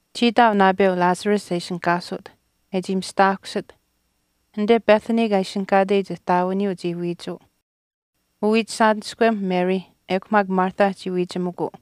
Chii ihtaau naapeu Lazarus e ishinihkaasut, e chii mista aahkusit. Anite Bethany kaa ishinihkaateyich ihtaawiniyuu chii wiichuu. Uwiichisaaniskwem Mary ekw maak Martha chii wiichimikuu.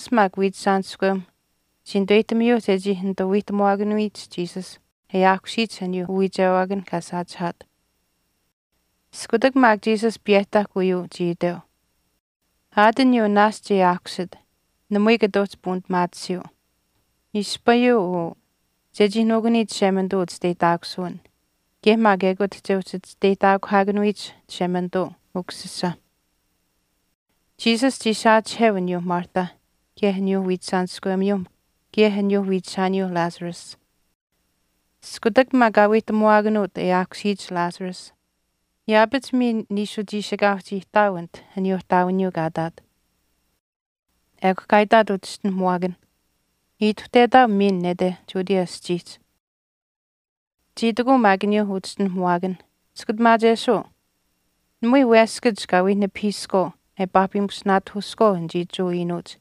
Lazarus maak wiichishaaniskwem chii nituweyihtamiyuuh chechii nituu wiihtamwaakanuyich Jesus e aahkusiyich aniyuu uwiichewaakan kaa saachihaat. Iskutak maak Jesus piyehtahk uyuu chii iteu, “Aat aniyuu naashch e aahkusit namui kata uhchi puunipimaatisiyuu. Ispayuu uu chechii nuukuniyich Chishemanituu uchisteyihtaakusuwin, kaye maak ekut che uhchi chisteyihtaakuhaakanuyich Chishemanituu Ukusisa.” Jesus chii saachiheu aniyuu Martha kaye aniyuu wiichishaaniskwemiyuu kaye aniyuuh wiichishaaniyuu Lazarus. Iskutak maak kaa wiihtamuwaakanuut e aahkusiyich Lazarus yaapach miin niishu chiishikaau chii ihtaau anit aniyuu ihtaawiniyuu kaa ihtaat. Ekw kaa itaat uchischinuhamuwaakanh, “Ituhtetaau miin nete Judea aschiihch.” Chii itikuu maak aniyuuh uchischinuhamuwaakanh, “Chiskutamaachesuu, namui weskach kaa wii nipahiiskwaau e paahpimusinaatahuuskwaau anichii Jewa iinuuch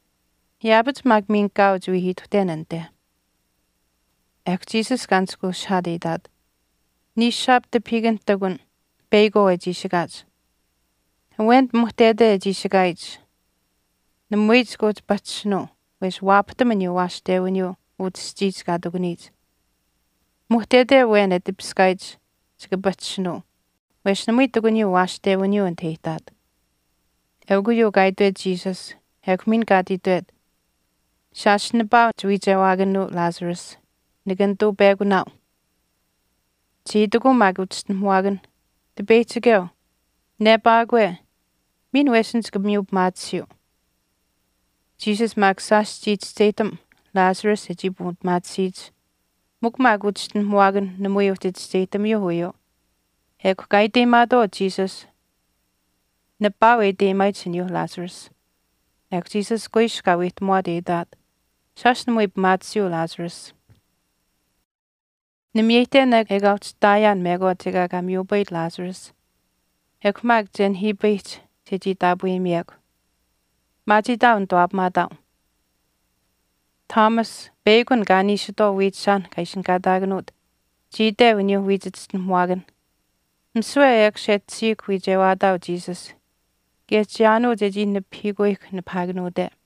yaapach maak miin kaau chii wii ituhten anite.” Ekw Jesus kaa nishkweushihaat e itaat, “Niishushaap tipahiikanh ihtakun peyakwaau e chiishikaach. Awen pimuhtete e chiishikaayich namui chika uhchi pahchishinuu wesh waapahtam aniyuu waashtewiniyuu utah aschiihch kaa ihtakuniyich. Pimuhtete awen e tipiskaayich chika pahchishinuu wesh namui ihtakuniyuu waashtewiniyuu anit e ihtaat.” Eukw uyuu kaa itwet Jesus ekw miin kaa ati itwet, “Shaash nipaau chiwiichewaakanuu Lazarus. Nika nituu pekunaau.” Chii itikuu maak uchischinuhamuwaakanh, “Utipeyihchikeu, nepaakwe, miin wesin chika miyu pimaatisiyuu.” Jesus maak shaash chii chischeyihtam Lazarus e chii puunipimaatisiyich mikw maak uchischinuhamuwaakanh namui uhchi chischeyihtamiyuuh uyuu ekw kaa iteyimaatwaau Jesus nipaau e iteyimaayich aniyuu Lazarus. Ekw Jesus kuiskw kaa wiihtamwaat e itaat, “Shaash namui pimaatisiyuu Lazarus. Nimiyeyihten ekaa uhchi ihtaayaan mekwaach ekaa kaa miyupayit Lazarus ekw maak che nihiipayihch chechii taapweyimiyekw. Maachiitaau nituwaapamaataau.” Thomas, peyakw an kaa niishitwaau wiichishaanh kaa ishinihkaataakanuut, chii iteu aniyuu wiich chischinuhamuwaakanh, “Misiwe ekush e tashiihkw wiichewaataau Jesus kaye chiyaanuu chechii nipahiikuyihkw nipahaakanuute.”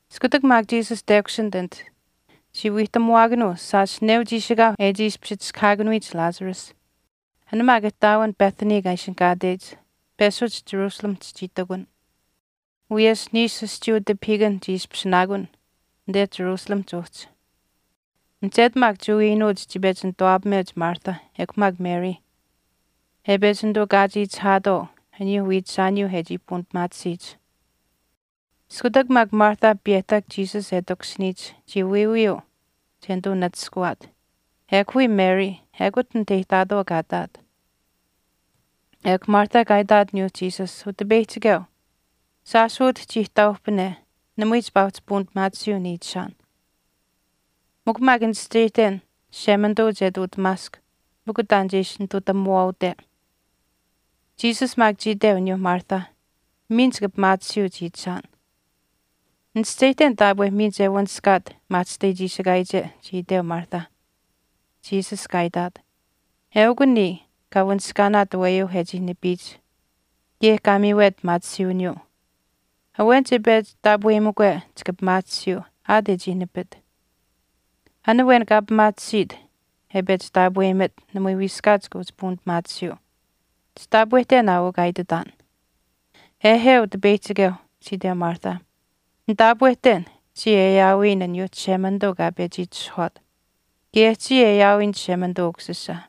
Iskutak maak Jesus tekushinit anite chii wiihtamuwaakanuu shaash neu chiishikaau e chii ishpish chiskahaakanuyich Lazarus. An maak ihtaawin Bethany kaa ishinihkaatech peshuch Jerusalemihch chii ihtakun, wiyesh niishu aschiiyuu tipahiikan chii ishpishinaakun anite Jerusalemihch uhchi. Mihchetu maak Jewa iinuuch chii pechi nituwaapameuch Martha ekw maak Mary e pechi nituu kaachiichihaatwaau aniyuu wiichishaaniyuu e chii puunipimaatisiyich. Iskutak maak Martha piyeyihtahk Jesus e takushiniyich chii wiiwiyuu che nituu nachishkawaat, ekw wii Mary ekut anit e ihtaatwaau kaa ihtaat. Ekw Martha kaa itaat aniyuu Jesus, “Utipeyihchikeu, shaash utah chii ihtaauhpane namui chipaa uhchi puunipimaatisiyuu niichishaan. Mikw maak nichischeyihten Chishemanituu che ihtuutamaask mikw taan che ishi nitutamuwaaute.” Jesus maak chii iteu aniyuu Martha, “Miin chika pimaatisiyuu chiichishaan.” “Nichischeyihten taapwe miin che wanishkaat maahchishtai chiishikaayiche,” chii iteu Martha. Jesus kaa itaat, “Eukw niya kaa wanishkaanaat aweyuu e chii nipiyich kaye kaa miiwet pimaatisiiwiniyuu. Awen che pechi taapweyimukwe chika pimaatisiyuu aat e chii nipit. An awen kaa pimaatisiit e pechi taapweyimit namui wiiskaat chika puunipimaatisiyuu. Chitaapwehten aa uu kaa ititaan.” “Ehe, Utipeyihchikeu,” chii iteu Martha. “Nitaapwehten chiya e aawiyin aniyuu Chishemanituu kaa pechi itishahwaat, kaye chiya e aawiyin Chishemanituu Ukusisa,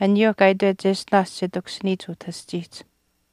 aniyuu kaa itwet cheshtinaash che takushiniyich utah aschiihch.”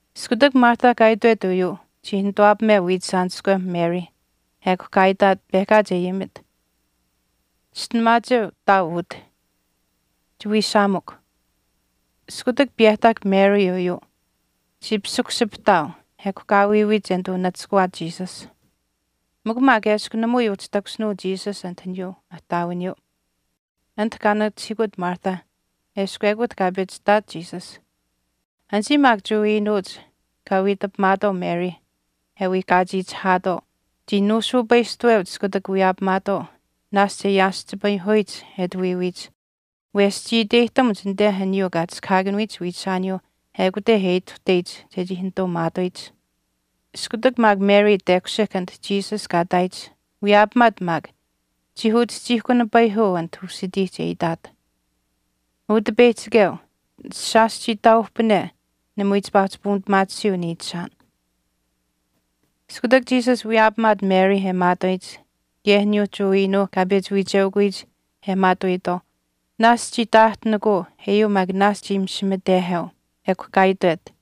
Iskutak Martha kaa itwet uyuu chii nituwaapameu wiichishaaniskwem Mary ekw kaa itaat pehkaach e ayimit, “Chischinuhamaacheu ihtaau utah. Chiwiishaamukw” Iskutak piyehtahk Mary uyuu chii pisikushipihtaau ekw kaa wiiwiit che nituu nachishkawaat Jesus. Mikw maak eshkw namui uhchi takushinuu Jesus anit aniyuu ihtaawiniyuu, anit kaa nachihiikut Martha eshkw ekut kaa pechi ihtaat Jesus. Anichii maak Jewa iinuuch kaa wiitapimaatwaau Mary e wii kaachiichihaatwaau chii nuusuupaistuweuch iskutak wiyaapamaatwaau naashch e yaaschipayihuyich e ati wiiwiiyich wesh chii iteyihtamuch anite aniyuu kaa chiskahaakanuyich wiichishaaniyuuh ekute e ituhteyich chechii nituu maatuyich. Iskutak maak Mary tekushihk anit Jesus kaa ihtaayich wiyaapamaat maak chii uchihchiihkunapayihuu anite usitiihch, e itaat, “Utipeyihchikeu, shaash chii ihtaauhpane namui chipaa uhchi puunipimaatisiyuu niichishaan.” Iskutak Jesus wiyaapamaat Mary e maatuyich kaye aniyuu Jewa iinuuh kaa pechi wiicheukuyich e maatuuyitwaau naashch chii taahtinikuu eyuu maak naashch chii misimiteheu. Ekw kaa itwet,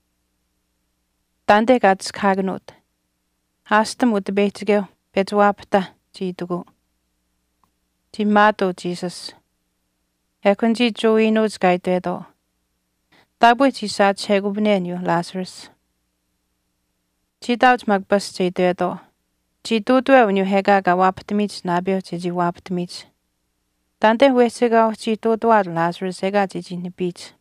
“Taanite kaa chiskahaakanuut.” “Aashtam Utipeyihchikeu pechi waapahtaa,” chii itikuu. Chii maatuu Jesus. Ekw anichii Jewa iinuuch kaa itwetwaau, “Taapwe chii saachihekupane aniyuu Lazarus.” Chii ihtaauch maak paashch e itwetwaau, “Chii ihtuutuweu aniyuu ekaa kaa waapahtamiyich naapeu chechii waapahtamiyich. Taanite wehchi ekaa uhchii ihtuutuwaat Lazarus ekaa chechii nipiyich.”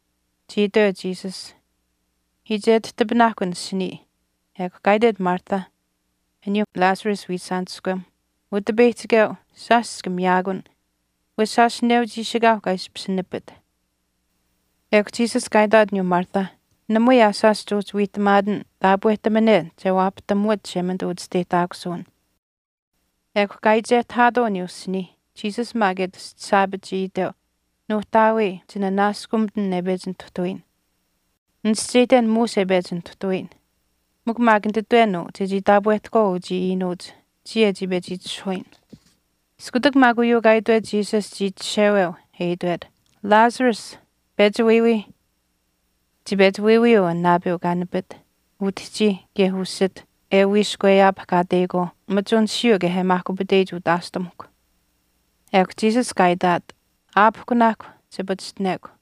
Chii itweu Jesus, “Iichetihtipinaahkw an asinii.” Ekw kaa itwet Martha aniyaa Lazarus wiichishaaniskwem, “Utipeyihchikeu, shaash chika miyaakun, wesh shaash neu chiishikaau kaa ishpish nipit.” Ekw Jesus kaa itaat aniyuu Martha, “Namui aa shaash chuuhchii wiihtamaatin, taapwehtamane che waapahtamuwat Chishemanituu uchisteyihtaakusuwin.” Ekw kaa iichehtahaatwaau aniyuu asinii. Jesus maak e tastasaapit chii iteu, “Nuuhtaawii chinanaaskumitin e pechi nituhtuyin. Nichischeyihten muush e pechi nituhtuyin, mikw maak nititwen uu chechii taapwehtahkwaau uchii iinuuch chii e chii pechi itishahuyin.” Iskutak maak uyuu kaa itwet Jesus chii chisheweu e itwet, “Lazarus, pechi wiiwiih.” Chii pechi wiiwiyuu an naapeu kaa nipit, utihchi kaye usit e wiishkweyaapahkaateyikwaau machunishiyuu kaye e maahkupiteyich utaashtamuhkw. Ekw Jesus kaa itaat, “Aapihkunaahkw, che pachishtinekw.”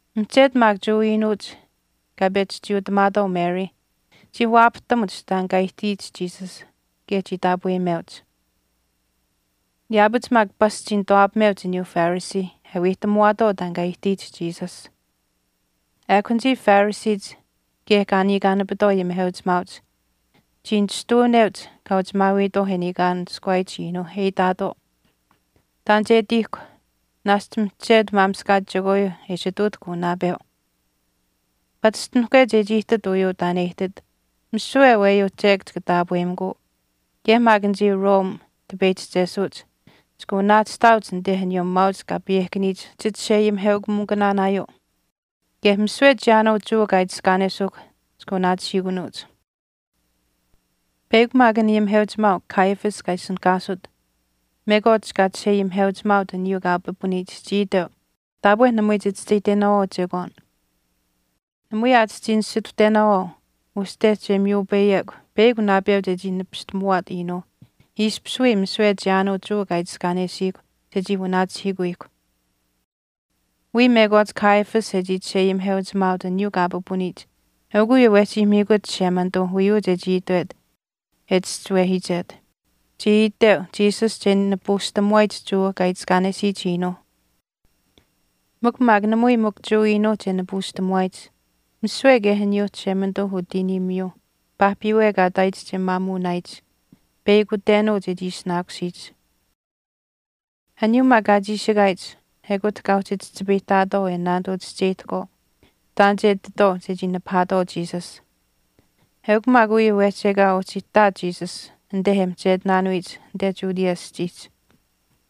Mihchetu maak Jewa iinuuch kaa pechi chiiutamaatwaau Mary chii waapahtamuch taan kaa ihtiyich Jesus kaye chii taapweyimeuch. Yaapach maak pasch chii nituwaapameuch aniyuuh Phariseeh e wiihtamuwaatwaau taan kaa ihtiyich Jesus. Ekw anichii Phariseech kaye kaa niikaanapitwaau ayimiheuchimaauch chii nishtuuneuch kaa uchimaawiitwaau kaa niikaanishkuwaayich iinuu e itaatwaau, “Taan che ihtiihkw. Naashch mihchetu maamishkaach chekwaayuu e ishi ihtuutahk uu naapeu. Pachishtinihkwe chechii ihtit uyuu taan e ihtit misiwe aweyuu chek chika taapweyimikuu kaye maak anichii Rome tipeyihchichesuuch chika wanaachihtaauch anite aniyuu maauch kaa payehkaniyich chichisheayimiheukamikunaanaayuu kaye misiwe chiyaanuu Jewa kaa itiskaanesuuhkw chika wanaachihiikunuuch.” Peyakw maak an ayimiheuchimaau Caiaphas kaa ishinihkaasut mekwaach kaa chisheayimiheuchimaaut aniyuu kaa pipuniyich chii iteu, “Taapwe namui chichischeyihtenaawaau chekwaan. Namui aa chichii nisituhtenaawaau uste che miyupayekw peyakw naapeu chechii nipistamuwaat iinuuh ishpish wii misiwe chiyaanuu Jewa kaa itiskaanesiihkw chechii wanaachihiikuyihkw.” Wiya mekwaach Caiaphas e chii chisheayimiheuchimaaut aniyuu kaa pipuniyich eukw uyuu wehchi miikut Chishemanituu uyuu chechii itwet e chischiwehiichet, chii iteu Jesus che nipuushtamuwaayich Jewa kaa itiskaanesiyich iinuuh. Mikw maak namui mikw Jewa iinuuh che nipuushtamuwaayich, misiwe kaye aniyuuh Chishemanituu utiiniimiyuuh paahpiiwe kaa ihtaayitwaauh che maamuunaayich, peyakutenuu chechii ishinaakusiyich. Aniyuu maak kaa chiishikaayich ekut kaa uhchi chihchipayihtaatwaau e naanituu chischeyihtahkwaau taan che ihtitwaau chechii nipahaatwaau Jesus. Eukw maak uyuu wehchi ekaa uhchi ihtaat Jesus anite e mihchetinaanuyich anite Judea aschiihch,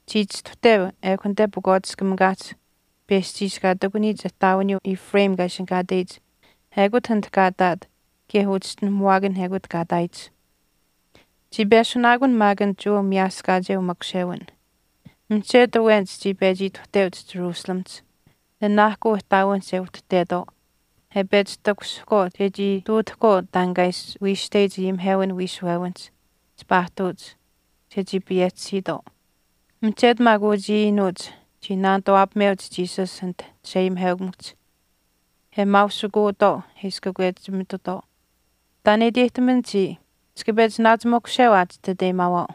chii chistuhteu ekw anite pakwaatiskamikaahch peschiish kaa ihtakuniyich ihtaawiniyuu Ephraim kaa ishinihkaateyich ekut anit kaa ihtaat kaye uchischinuhamuwaakan ekute kaa ihtaayich. Chii peshunaakun maak an Jewa miyaaskaacheu makushewin. Mihchetu awenich chii pechi ituhteuch Jerusalemihch nanaahkuu ihtaawinihch e uhtuhtetwaau e pechi takushihkwaau chechii ihtuutahkwaau taan kaa ishi wiishteyich ayimihewin wiishuwewinihch chipaa ihtuuch chechii payehchisiitwaau. Mihchetu maak uchii iinuuch chii naanituwaapameuch Jesus anit chisheayimiheukamikuhch e maausukuutwaau e ishi kakwechimitutwaau, “Taan e iteyihtaman chiya, chika pechi naachi makusheu aa chititeyimaau.”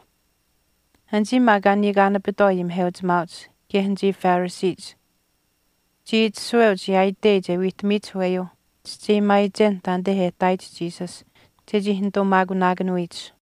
Anichii maak kaa niikaanapitwaau ayimiheuchimaauch kaye anichii Phariseech chii itashuweuch yaaitei che wiihtamiyich aweyuuh chischeyimaayichen taanite e ihtaayich Jesus chechii nituu maakunaakanuyich.